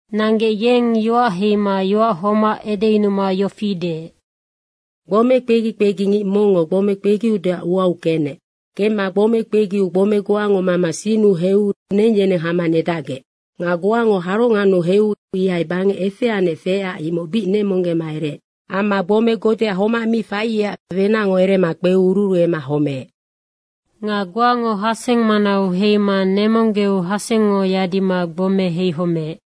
Nanggec yeng yoac heima yoac homac edeyunuma yofi deec, “Gbome kpegi kpegingic mongngo gbome kpegiudeac uau kenec. Kemma gbome kpegiu gbome goango mama sinnu heiu neng yeneng hama nedacgec. Nga goango harongannu heiu ihai bangec efeanec feecac imoc bic nemonggema ereec. Amma gbome godea homac mi faiecac wenacngo erema kpeu ururuema homeec. Nga goango haseng manau heima nemonggeu hasengngo yadima gbome heihomeec.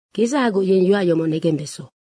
Kedzahagoc yeng yoac yomoc negembeso.”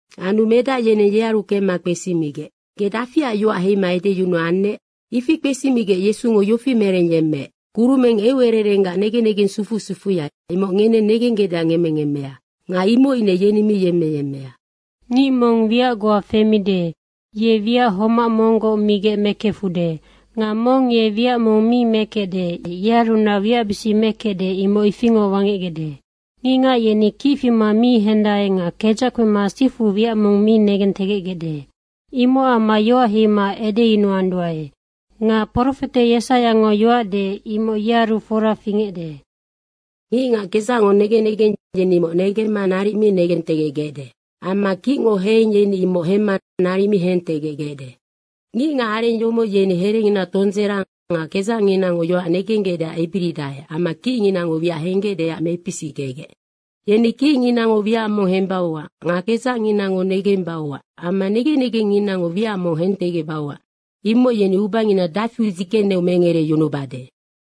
Anu medac yeneng yearu kemma kpesimigec, “Ge dafiac yoac heima edeyunuannec?” Ifi kpesimigec Yesungo yofi merengyemmeec, “Kurumeng eucererenggac negen negeng sufu sufuya, imoc ngeneng negenggecdeac ngemmengemmea. Nga imoc ine yeni mi yemmeyemmea. Ngic mong wiac goa femide, ye wiac homac monggoc migec mekefude. Nga mong ye wiac mong mi mekecde, yearunac wiacbisic mekecde, imoc ifingoc wangecgecde. Ngicngac yeni kic fima mi hendae nga kedzac kpema sifu wiac mong mi negentegecgecde. Imocac amma yoac heima edeyunuanduae. Nga profete Yesaiango yoac deec, imoc yenearu fora fingecde, ‘Ngicngac kedzacngo negen negeng, yeni imoc negemma naric mi negentegecgecde. Amma kicngo heheng yeni imoc hemma naric mi hentegecgecde. Ngicngacareng yomoc yeni herengina tondzera nga kedzacnginango yoac negenggecdeac ebiridae amma kicnginango wiac henggecdeac mepisickegec. Yeni kicnginango wiac mong hembauac nga kedzacnginango negembauac amma negen negengnginango wiac mong negentegecbauac, imoc yeni ubangina dafiu dzigeneu mengereyunubade.’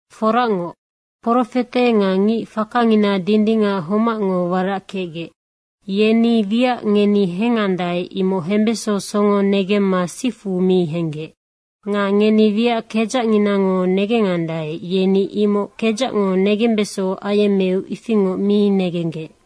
Foracngoc, profete nga ngic fakangina dindingac homacngo warac kecgec, yeni wiac ngeni hengandae, imoc hembeso songo negemma sifu mi henggec. Nga ngeni wiac kedzacnginango negengandae, yeni imoc kedzacngo negembeso ayemmeu ifingoc mi negenggec.”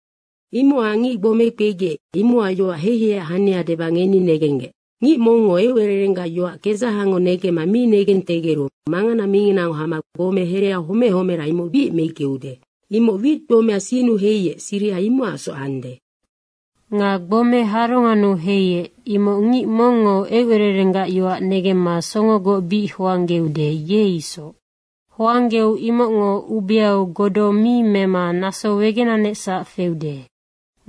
“Imocac ngic gbome kpegiec, imocac yoac heiheiac hania deba ngeni negenggec. Ngic mongngo eucererenggac yoac kedzahango negemma mi negentegeru mangana minginango hama gbome hereau homec homera, imoc bic meickeude. Imoc wit gbomea sinnu heiec, siriha imocacsoc ande. Nga gbomea harongannu heiec, imoc ngic mongngo eucererenggac yoac negemma songogoc bic hoanggeude, ye isoc. Hoanggeu imocngo ubeau godo mi mema naso wegenanecsac feude.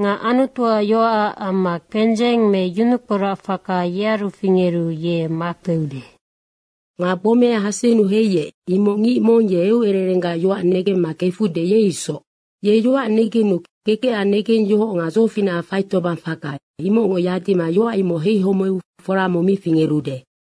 Nga Anutuac yoacac amma kpendzeng me yunukporacfaka yearu fingeru ye makpeude. Nga gbomea hasennu heiec, imoc ngic mong ye eucererenggac yoac negemma kefude, ye isoc. Ye yoac negenu kekecac negengyohoc nga dzofinacac faitobangfaka imocngo yadima yoac imoc heihomeu fora mong mi fingerude.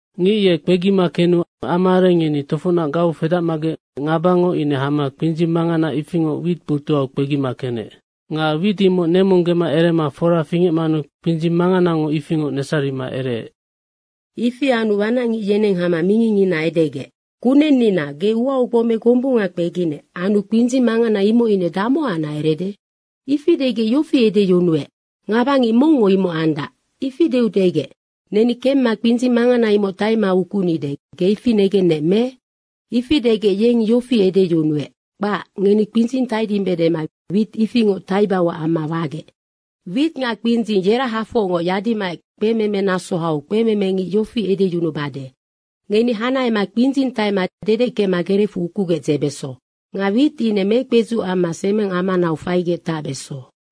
Ngic ye kpegima kenu amaareng yeni tofocnac gau fedacmagec ngabango ine hama kpindzing mangana ifingoc wit botuhau kpegima kenec. Nga wit imoc nemonggema erema fora fingecmanu kpindzing manganango ifingoc nesarima ereec. Ifi anu wanacngic yeneng hama mingingngina edegec, ‘Kunennina, ge uau gbome gombunga kpeginec anu kpindzing mangana imoc ine damohacnac erede?’ Ifi degec yofi edeyunuec, ‘Ngabangic mongngo imoc andac.’ Ifi deu degec, ‘Neni kemma kpindzing mangana imoc taima ukunide, ge ifi negennec, me?’ Ifi degec yeng yofi edeyunuec, ‘Kpac, ngeni kpindzing taidimbe dema wit ifingoc taibauac amma wagec.’ Wit nga kpindzing yerahafocngoc yadimaec kpememe naso hau kpememengic yofi edeyunubade, ‘Ngeni hanahema kpindzing taima dedeckema gerecfu ukugec dzebeso. Nga wit ine mekpedzuc amma semengamanau faigec tacbeso.’”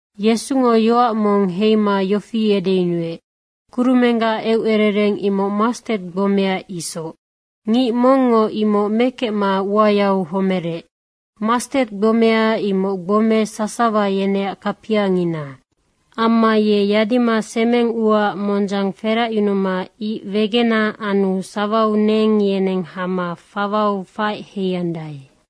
Yesungo yoac mong heima yofi edeyunuec, “Kurumenggac eucerereng imoc mastet gbomea isoc, ngic mongngo imoc mekemma uayau homerec. Mastet gbomea, imoc gbome sasawa yeneac kapiangina. Amma ye yadima semeng uaac mondzang feracyunuma ic wegena anu sawau neng yeneng hama fawau faec heiandae.”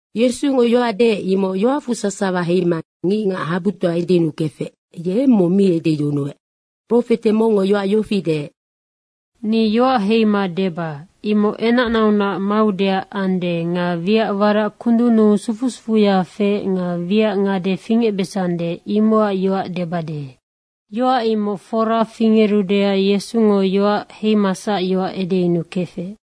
Yesungo yoac deec, imoc yoacfu sasawa heima ngicngac habutoa edeyunukefec, ye eng mong mi edeyunuec. Profete mongngo yoac yofi deec, “Ni yoac heima deba, imoc enacnaunac maudeac ande nga wiac warac kundunnu sufu sufuya feec nga wiac ngade fingecbesande, imocac yoac debade.” Yoac imoc fora fingerudeac Yesungo yoac heimasac yoac edeyunukefec.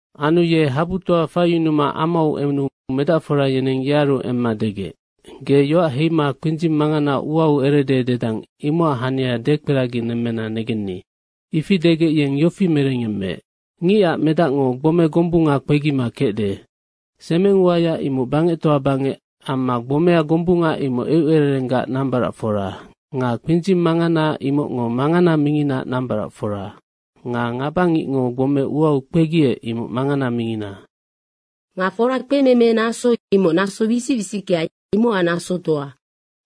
Anu ye habutoa faiyunuma amau enu medacfora yeneng yearu emma degec, “Ge yoac heima kpindzing mangana uau erede dedang, imocac hania dekperaginemmena negenni.” Ifi degec yeng yofi merengyemmeec, “Ngicac Medacngo gbome gombunga kpegima kecde. Semeng uaya imoc bangectoa bangec amma gbomea gombunga imoc eucererenggac nambaracfora. Nga kpindzing mangana imocngo mangana minginaac nambaracfora. Nga ngabangicngo gbome uau kpegiec, imoc mangana mingina. Nga fora kpememe naso, imoc naso wisic wisickea, imocac nasotoa.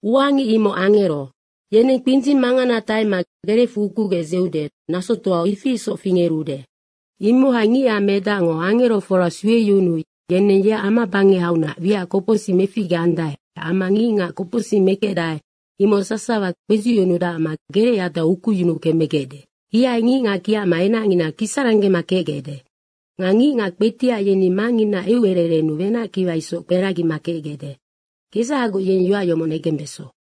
Uangic imoc angero. Yeneng kpindzing mangana taima gerecfu ukugec dzeude, nasotoau ifi isoc fingerude. Imohai Ngicac Medacngo angerofora sueyunuu yeneng yeac amabangehaunac wiac kopocsic meficgeande amma ngicngac kopocsic mekecdae, imoc sasawa kpezucyunudacma gerecyadau ukuyunuu kemegecde. Ihai ngicngac kiacma enacngina kisaranggema kecgecde. Nga ngicngac kpetiac yeni Mangnginaac eucererennu wenackiwa isoc kperagima kecgecde. Kedzahagoc yeng yoac yomoc negembeso.”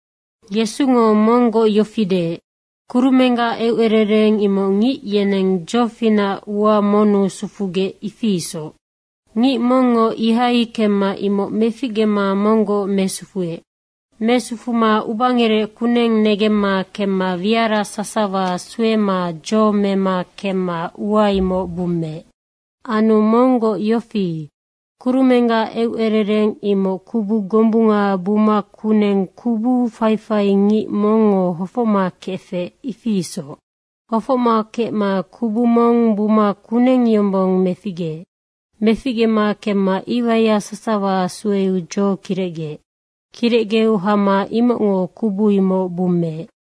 Yesungo monggoc yofi deec, “Kurumenggac eucerereng imoc ngic yeneng dzofinac ua monnu sufugec, ifi isoc. Ngic mongngo ihai kemma imoc meficgema monggoc mesufuec. Mesufuma ubangerec kuneng negemma kemma wiara sasawa suema dzo mema kemma ua imoc bummeec. Anu monggoc yofi, kurumenggac eucerereng imoc kubu gombunga buma kuneng kubu faifaingic mongngo hofocma kefec, ifi isoc. Hofoc kecma kubu mong buma kuneng yombong meficgeec. Meficgema kemma iwaiya sasawa sueu dzo kirecgeec. Kirecgeu hama imocngo kubu imoc bummeec.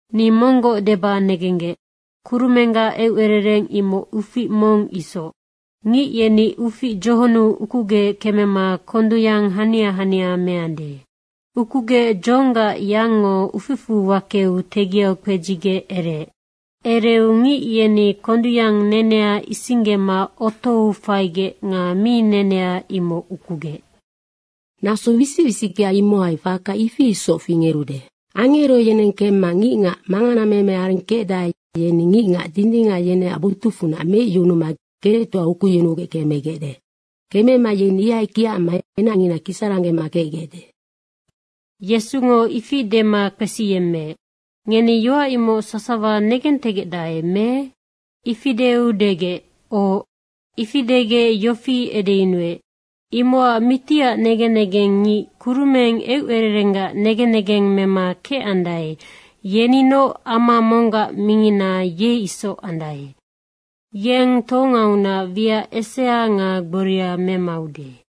Ni monggoc deba negenggec, kurumenggac eucerereng imoc ufic mong isoc. Ngic yeni ufic dzohonnu ukugec kemema kondung yang hania hania meande. Ukugec dzohonggac yangngo uficfu wakeu tegiau kpedzigec ereec. Ereu ngic yeni kondungyang nenea isinggema otou faigec nga mi nenea, imoc ukugec. Naso wisic wisickea imohai faka ifi isoc fingerude. Angero yeneng kemma ngicngac manganameme areng kecdae, yeni ngicngac dindingac yeneac botucfunac meicyunuma gerectoau ukuyunugec kemegecde. Kemema yeni ihai kiacma enacngina kisaranggema kecgecde.” Yesungo ifi dema kpesiyemmeec, “Ngeni yoac imoc sasawa negentegecdae me?” Ifi deu degec, “Oc.” Ifi degec yofi edeyunuec, “Imocac mitiac negen negengngic kurumeng eucererenggac negen negeng mema kecandae, yeninoc ama monggac mingina, ye isoc andae. Yeng tohongaunac wiac esea nga gboria memaude.”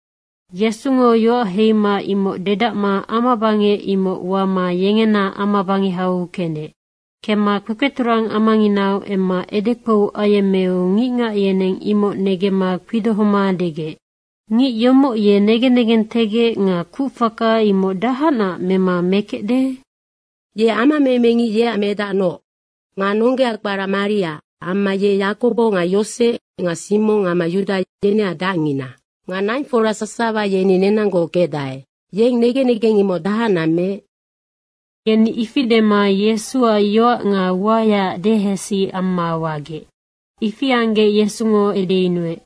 Yesungo yoac heima imoc dedacma amabangec imoc wama yengena amabangehau kenec. Kemma kpekpeturang amanginau emma edekpou ayemmeu ngicngac yeneng imoc negemma kpidohoma degec, “Ngic yomoc ye negen negentegec nga kucfaka imoc dahacnac mema mekecde? Ye amamemengic yeac medacnoc. Nga nonggea kpara Maria amma ye Yakobo nga Yosec nga Simong amma Yuda yeneac dacngina. Nga naingfora sasawa yeni nenanggoc kecdae. Yeng negen negeng imoc dahacnac meec?” Yeni ifi dema Yesuac yoac nga uayaac dehesi amma wagec. Ifi anggec Yesungo edeyunuec,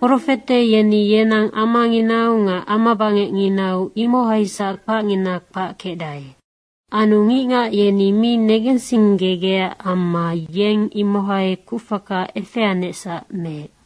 “Profete yeni yenang amanginau nga amabangecnginau, imohaisac kpacngina kpac kecdae.” Anu ngicngac yeni mi negensinggegecac amma yeng imohai kucfaka efeanecsac meec.